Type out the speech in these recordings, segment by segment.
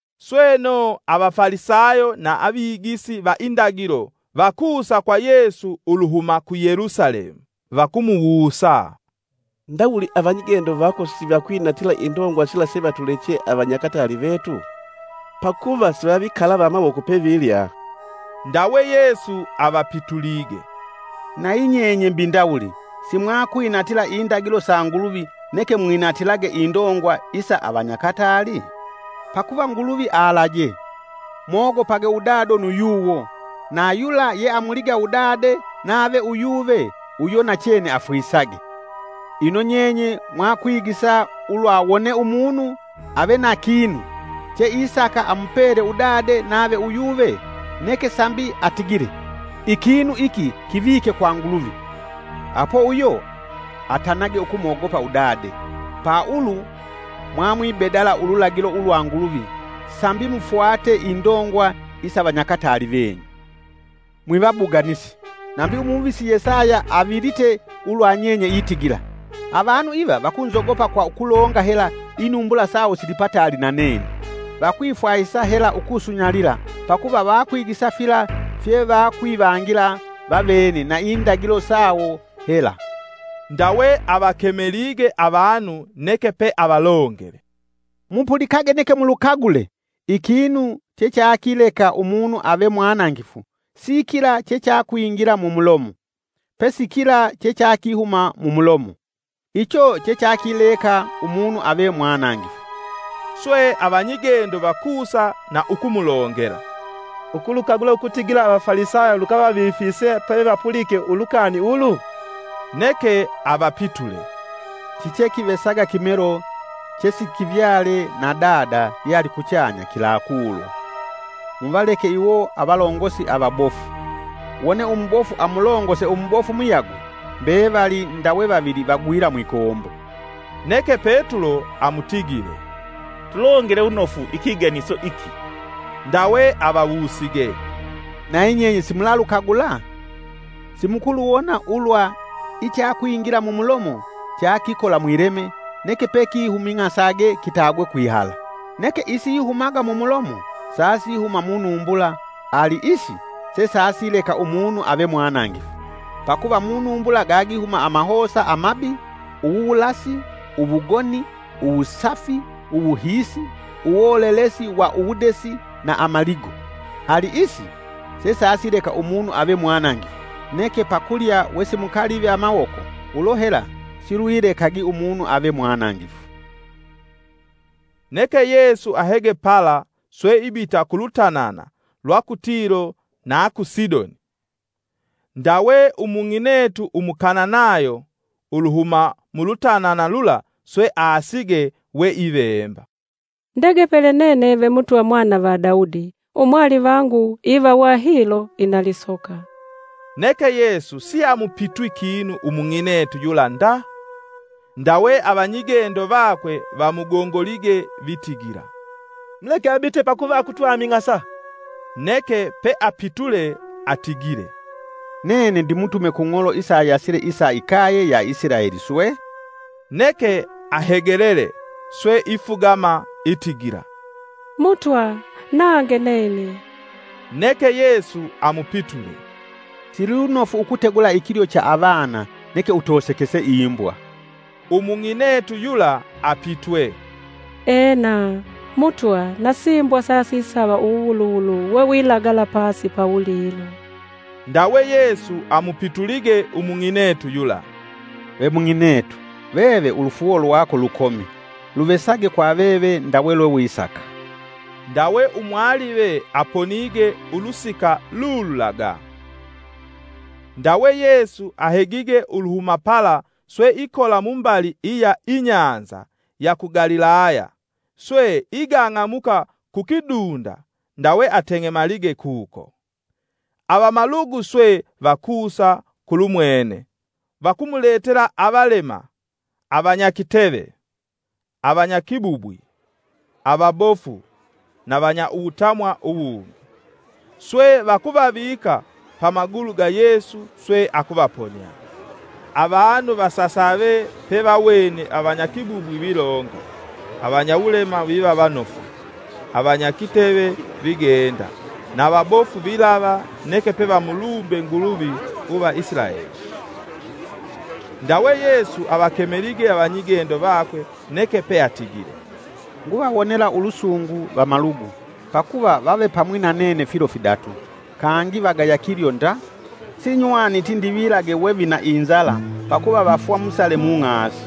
Sweno Avafalisayo na avigisi va indagilo vakusa kwa Yesu uluhuma ku Yelusalemu. “Vakumuwusa, ndawuli avanyigendo vako sivakwinatila indongwa sila sevatuleche avanyakataali vetu? Pakuva sivavikalava amawoko pevilya.” Ndawe Yesu avapitulige, “Nayi nyenye mbi ndawuli simwakwinatila indagilo sa Nguluvi neke mwinatilage indongwa isa avanyakatali? Pakuva Nguluvi alaje: ‘mogopage udado na yuyuwo’ na, ‘Yula yeamuliga udade nave uyuve uyo nachene afwisage.’ Ino nyenye mwakwigisa ulwa, wone umunu ave na kinu, che isaka amupele udade nave uyuve, neke sambi atigile, ‘Ikinu iki kivike kwa Nguluvi,’ apo uyo atanage ukumwogopa udade, pa ulu mwamwibedala ululagilo ulwa Nguluvi, sambi mufwate indongwa isa vanyakatali venyu. Mwivabuganisi, nambi umuvisi Yesaya avilite ulwa nyenye itigila: ‘Avanu iva vakunzogopa kwa kulonga hela Inumbula sawo silipataali na nene. Vakwifwahisa hela ukusunyalila pakuva vakwigisa fila fye vakwivangila vavene na indagilo sawo hela!’” Ndawe avakemelige avanu neke pe avalongele, “Mupulikage neke mulukagule! Ikinu chechakileka umunu ave mwanangifu sikila chechakwingila mumulomo, pesi kila chechakihuma mumulomo. Icho chechakileka umunu ave mwanangifu.” Swe avanyigendo vakusa na ukumulongela, “Ukulukagula ukutigila Avafalisayo lukavavifise pevapulike ulukani ulu?” Neke avapitule, “Chichekivesaga kimelo chesikivyale na dada yealikuchanya kilakulwa. Muvaleke iwo avalongosi avabofu. Wone umubofu amulongose umubofu muyagwe mbevali ndawe vavili vagwila mwikombo.” Neke Petulo amutigile, “Tulongele wunofu ikiganiso iki.” Ndawe avawusige, “Nayi nyenye simulalukagula? Simukuluwona ulwa ichakikwingila mumulomo cha kikola mwileme neke pekihuming'ase kitagwe kwihala? Neke isihumaga mu mulomo sasihuma munumbula ali isi sesasileka umunu ave mwanangifu. Pakuva munumbula gagihuma amahosa amabi, uwuwulasi, uwugoni, uwusafi, uwuhiisi, uwolelesi wa uwudesi na amaligo. Ali isi sesasileka umunu ave mwanangifu, neke pakulya wesimukalivi amawoko ulo hela silwilekagi umunu ave mwanangifu.” Neke Yesu ahege pala swe ibita ku lutanana lwa ku Tilo na ku Sidoni. Ndawe umung'inetu Umukananayo uluhuma mulutanana lula swe aasige we ivemba, “Ndegepele nene ve Mutwa mwana va Daudi, Umwalivangu ivawa hilo ina lisoka.” Neke Yesu siamupitwi kinu umung'inetu yula nda. Ndawe avanyigendo vakwe vamugongolige vitigila, “Muleke abite pakuva akutwaming'asa.” Neke peapitule atigile, “Nene ndimutume ku ng'olo isayasile isa ikaye ya Isilaeli swe.” Neke ahegelele swe ifugama itigila, “Mutwa nange nene.” Neke Yesu amupitule, “Silunofu ukutegula ikilyo cha avana neke utosekese imbwa.” Umung'inetu yula apitwe, “Ena! Mutwa na simbwa sasisava uwuwuluwulu wewilagala pasi pawulilo.” Ndawe Yesu amupitulige umung'inetu yula, “Ve mung'inetu, veve ulufuuwo lwako lukomi! luvesage kwa veve ndawe lwe wisaka.” Ndawe umwalive aponige ulusika lululaga. Ndawe Yesu ahegige uluhuma pala swe ikola mumbali iya inyanza ya ku Galilaya, swe igang'amuka kukidunda, ndawe ateng'emalige kuko. Avamalugu swe vakusa kulumwene, vakumuletela avalema, avanya kiteve, avanyakibubwi, avabofu na vanya uwutamwa uwungi. Swe vakuvavika pamagulu ga Yesu swe akuvaponia. Avanu vasasave pevawene avanyakibubwi vilonga, avanya wulema viva vanofu, avanya kiteve vigenda na vabofu vilava neke pevamulumbe Nguluvi uva Isilaeli. Ndawe Yesu avakemelige avanyigendo vakwe neke peatigile, “Nguvawonela ulusungu vamalugu, pakuva vavepamwi na nene filo fidatu, kangi vagaya kilyo nda; sinywaniti ndivilage we vina inzala pakuva vafwa musale mung'asi.”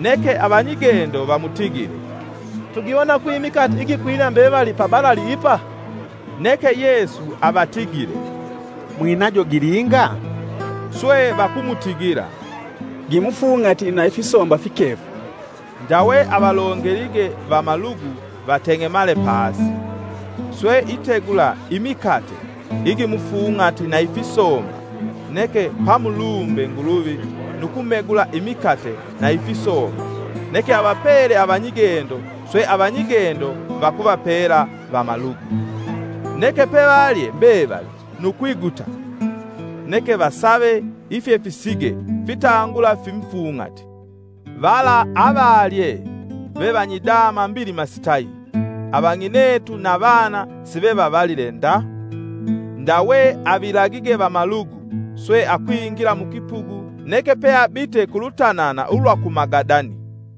Neke avanyigendo vamutigile, “Tugiwona kwi imikate igikwila mbevali pabalali ipa?” Neke Yesu avatigile, “Mwinajo gilinga?” Swe vakumutigila, “Gimufung'ati na ifisomba fikefu.” Ndawe avalongelige vamalugu vateng'emale pasi. Swe itegula imikate igimufung'ati na ifisomba neke pamulumbe Nguluvi nu kumegula imikate na ifisomba neke avapele avanyigendo swe avanyigendo vakuvapela vamalugu. Neke pevalye mbevali nu kwiguta. Neke vasave ifyefisige fitangula fimufung'ati. Vala avalye ve vanyidama mbilima sitayi, avang'inetu na vana sivevavalile nda. Ndawe avilagige vamalugu, swe akwingila mukipugu neke pe abite kulutanana ulwa ku Magadani.